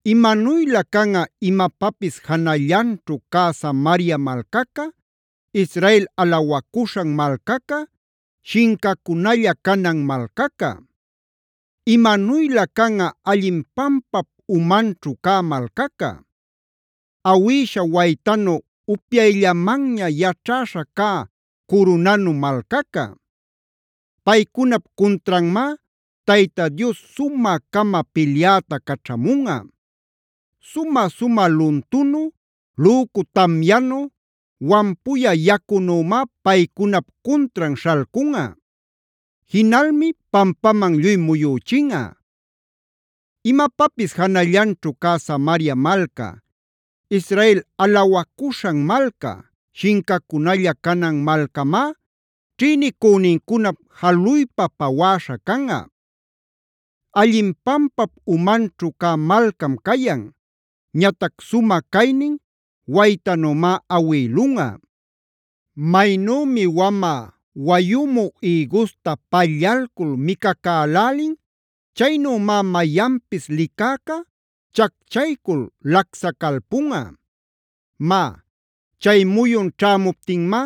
Imanuylä canꞌa imapapis janallanćhu cä Samaria malcaca, Israela alawacuśhan malcaca, shincacunalla canan malcaca. Imanuylä canꞌa allin pampap umanćhu cä malcaca; awïsha waytanu upyayllamanña yaćhäśha cä curunanu malcaca. Paycunap cuntranmá Tayta Dios sumä-cama pilyäta caćhamunꞌa; sumä-sumä luntunu, lücu tamyanu, wampuyä yacunümá paycunap cuntran śhalcunꞌa. Jinalmi pampaman lluy muyüchinꞌa. Imapapis janallanćhu cä Samaria malca, Israel alawacuśhan malca, shincacunalla canan malcamá, ćhïnicünincunap jaluypa pawäśha canꞌa. Allin pampap umanćhu cä malcam cayan; ñatac sumä caynin waytanümá awïlunꞌa. Maynümi wamä wayumü ïgusta pallalcul micacälälin, chaynümá mayanpis licäca chacchaycul lacsacalpunꞌa. Má, chay muyun ćhämuptinmá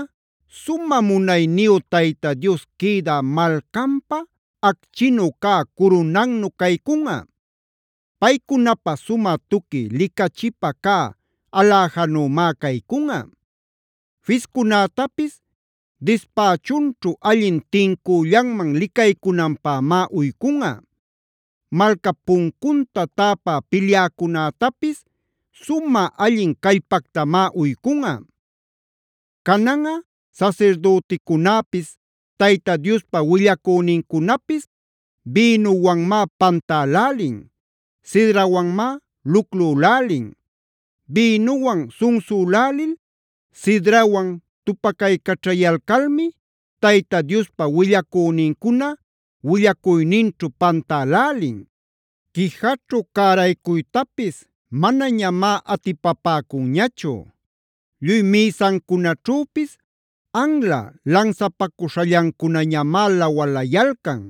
sumä munayniyu Tayta Dios quïdä malcanpä acchinu cä curunannu caycunꞌa. Paycunapä sumä tuqui licachipa cä aläjanümá caycunꞌa. Fiscunätapis dispächunćhu allin tincüllanman licaycunanpämá uycunꞌa. Malcap puncunta täpä pilyäcunätapis sumä allin callpactamá uycunꞌa. Cananꞌa sasirdüticunäpis, Tayta Diospa willacünincunapis bïnuwanmá pantälälin; sidrawanmá luclülälin. Bïnuwan sunsülälil, sidrawan tupacaycaćhayalcalmi, Tayta Diospa willacünincuna willacuyninćhu pantälälin; quijaćhu cäraycuytapis manañamá atipapäcunñachu. Lluy mïsancunaćhüpis anla lansapacuśhallancunañamá lawalayalcan;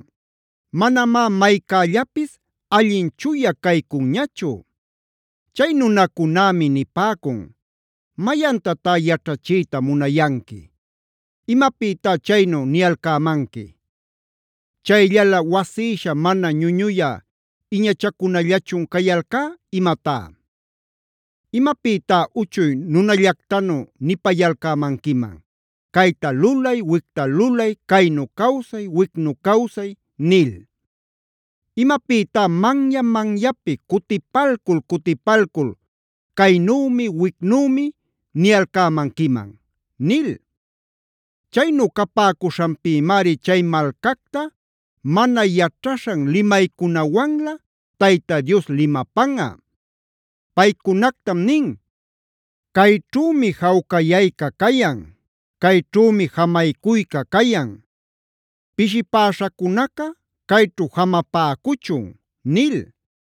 manamá maycällapis allin chuya caycunñachu. Chay nunacunämi nipäcun: “¿Mayantatá yaćhachiyta munayanqui? ¿Imapïtá chaynu niyalcämanqui? ¿Chayllala wasïsha mana ñuñuyä iñachacunallachun cayalcá imatá? ¿Imapïtá uchuy nunallactanu nipayalcämanquiman: ‘cayta lulay, wicta lulay; caynu cawsay, wicnu cawsay’ nil? ¿Imapïtá manya-manyapi cutipalcul-cutipalcul: ‘caynümi-wicnümi’ niyalcämanquiman?” nil. Chaynu capäcuśhanpïmari chay malcacta mana yaćhaśhan limaycunawanlä Tayta Dios limapanꞌa. Paycunactam nin: “Cayćhümi jawcayayca cayan; cayćhümi jamaycuyca cayan; pishipäśhacunaca cayćhu jamapäcuchun” nil.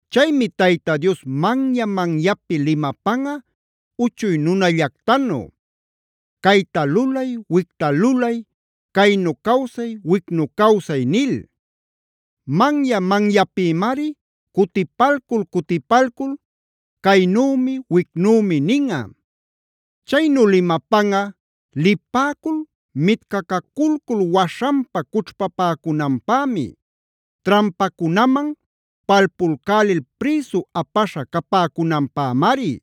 Chaymi Tayta Dios manya-manyapi limapanꞌa uchuy nunallactanu: “Cayta lulay, wicta lulay; caynu cawsay, wicnu cawsay” nil. Manya-manyapïmari cutipalcul-cutipalcul: “Caynümi wicnümi” ninꞌa. Chaynu limapanꞌa lipäcul mitcacaculcul waśhanpa cućhpapäcunanpämi; trampacunaman palpulcälil prïsu apaśha capäcunanpämari.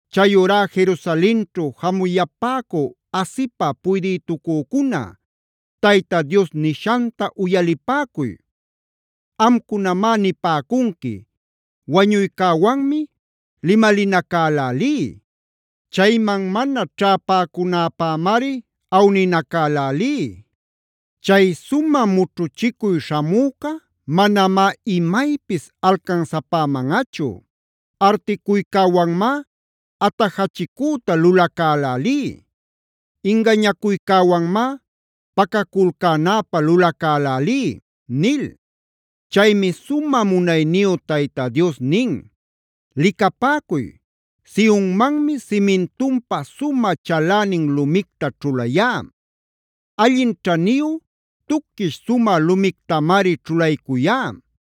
Chayurá Jerusalenćhu jamuyapäcü asipä puydïtucücuna, Tayta Dios nishanta uyalipäcuy. Amcunamá nipäcunqui: “Wañuycäwanmi limalinacälälí; chayman mana ćhapäcunäpämari awninacälälí. Chay sumä mućhuchicuy śhamüca manamá imaypis alcansapämanꞌachu; articuycäwanmá atajachicüta lulacälälí; ingañacuycäwanmá pacaculcänäpä lulacälälí” nil. Chaymi sumä munayniyu Tayta Dios nin: “Licapäcuy, Sionmanmi simintunpä sumä chalänin lumicta ćhulayá; allin ćhaniyu, tuquish sumä lumictamari ćhulaycuyá.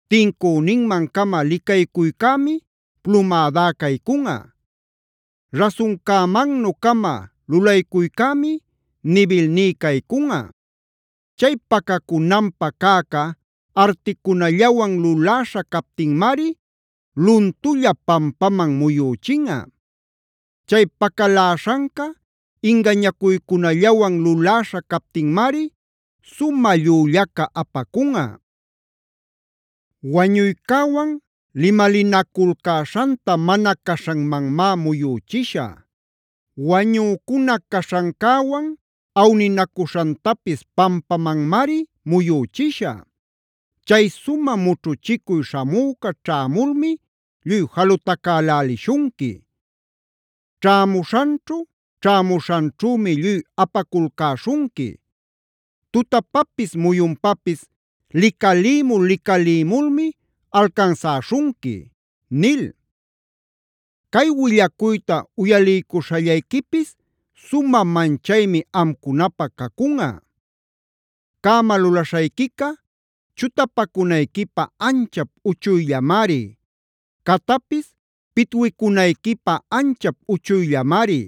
Tincüninman-cama licaycuycämi plumädá caycunꞌa; rasuncämannu-cama lulaycuycämi nibilní caycunꞌa. Chay pacacunanpä cäca articunallawan luläśha captinmari luntulla pampaman muyüchinꞌa. Chay pacaläśhanca ingañacuycunallawan luläśha captinmari sumä llüllaca apacunꞌa. Wañuycäwan limalinaculcäśhanta mana caśhanmanmá muyüchishä; wañücuna caśhancäwan awninacuśhantapis pampamanmari muyüchishä. Chay sumä mućhuchicuy śhamüca ćhämulmi lluy jalutacälälishunqui. Ćhämuśhanćhu, ćhämuśhanćhümi lluy apaculcäśhunqui; tutapapis muyunpapis licalïmul-licalïmulmi alcansäśhunqui” nil. Cay willacuyta uyaliycuśhallayquipis sumä manchaymi amcunapä cacunꞌa. Cäma lulaśhayquica chutapacunayquipä anchap uchuyllamari; catapis pitwicunayquipä anchap uchuyllamari.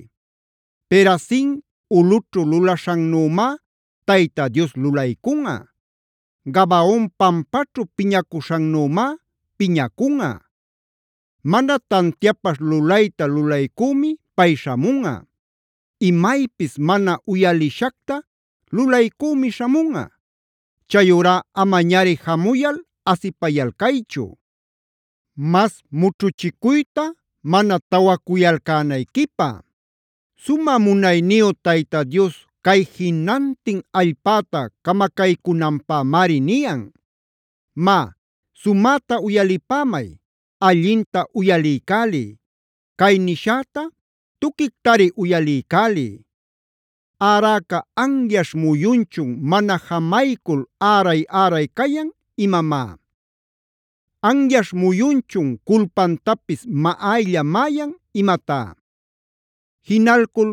Perazim ulꞌućhu lulaśhannümá Tayta Dios lulaycunꞌa;d Gabaon pampaćhu piñacuśhannümá piñacunꞌa.e Mana tantiapaśh lulayta lulaycümi pay śhamunꞌa; imaypis mana uyalishacta lulaycümi śhamunꞌa. Chayurá amañari jamuyal asipayalcaychu, mas mućhuchicuyta mana tawacuyalcänayquipä. Sumä munayniyu Tayta Dios cay jinantin allpäta camacaycünanpämari niyan. Má, sumäta uyalipämay; allinta uyaliycäliy; cay nishäta tuquictari uyaliycäliy. ¿Äräca anyaśh muyunchun mana jamaycul äray-äray cayan imamá? ¿Anyaśh muyunchun culpantapis maꞌaylla-maꞌayan imatá? Jinalcul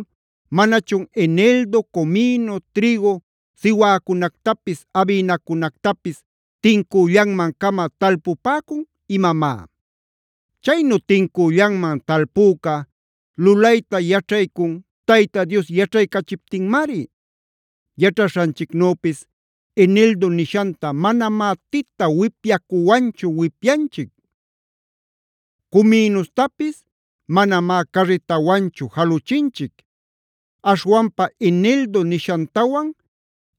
¿manachun eneldo, comino, trïgu, siwäcunactapis, abïnacunactapis tincüllanman-cama talpupäcun imamá? Chaynu tincüllanman talpüca, lulayta yaćhaycun Tayta Dios yaćhaycachiptinmari. Yaćhaśhanchicnüpis eneldo nishanta manamá tita wipyacuwanchu wipyanchic; cominustapis manamá carritawanchu jaluchinchic. Aśhwanpa eneldo nishantawan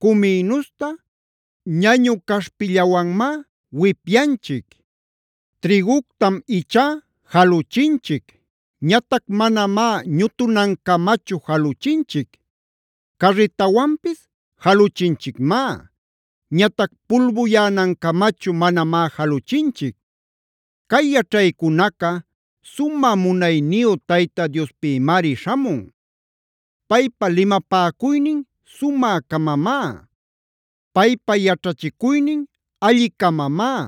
cominusta ñañu caśhpillawamá wipyanchic. Trïguctam ichá jaluchinchic; ñatac manamá ñutunancamachu jaluchinchic. Carritawanpis jaluchinchicmá; ñatac pulbuyänancamachu manamá jaluchinchic. Cay yaćhaycunaca sumä munayniyu Tayta Diospïmari śhamun. Paypa limapäcuynin sumä-camamá. Paypa yaćhachicuynin alli-camamá.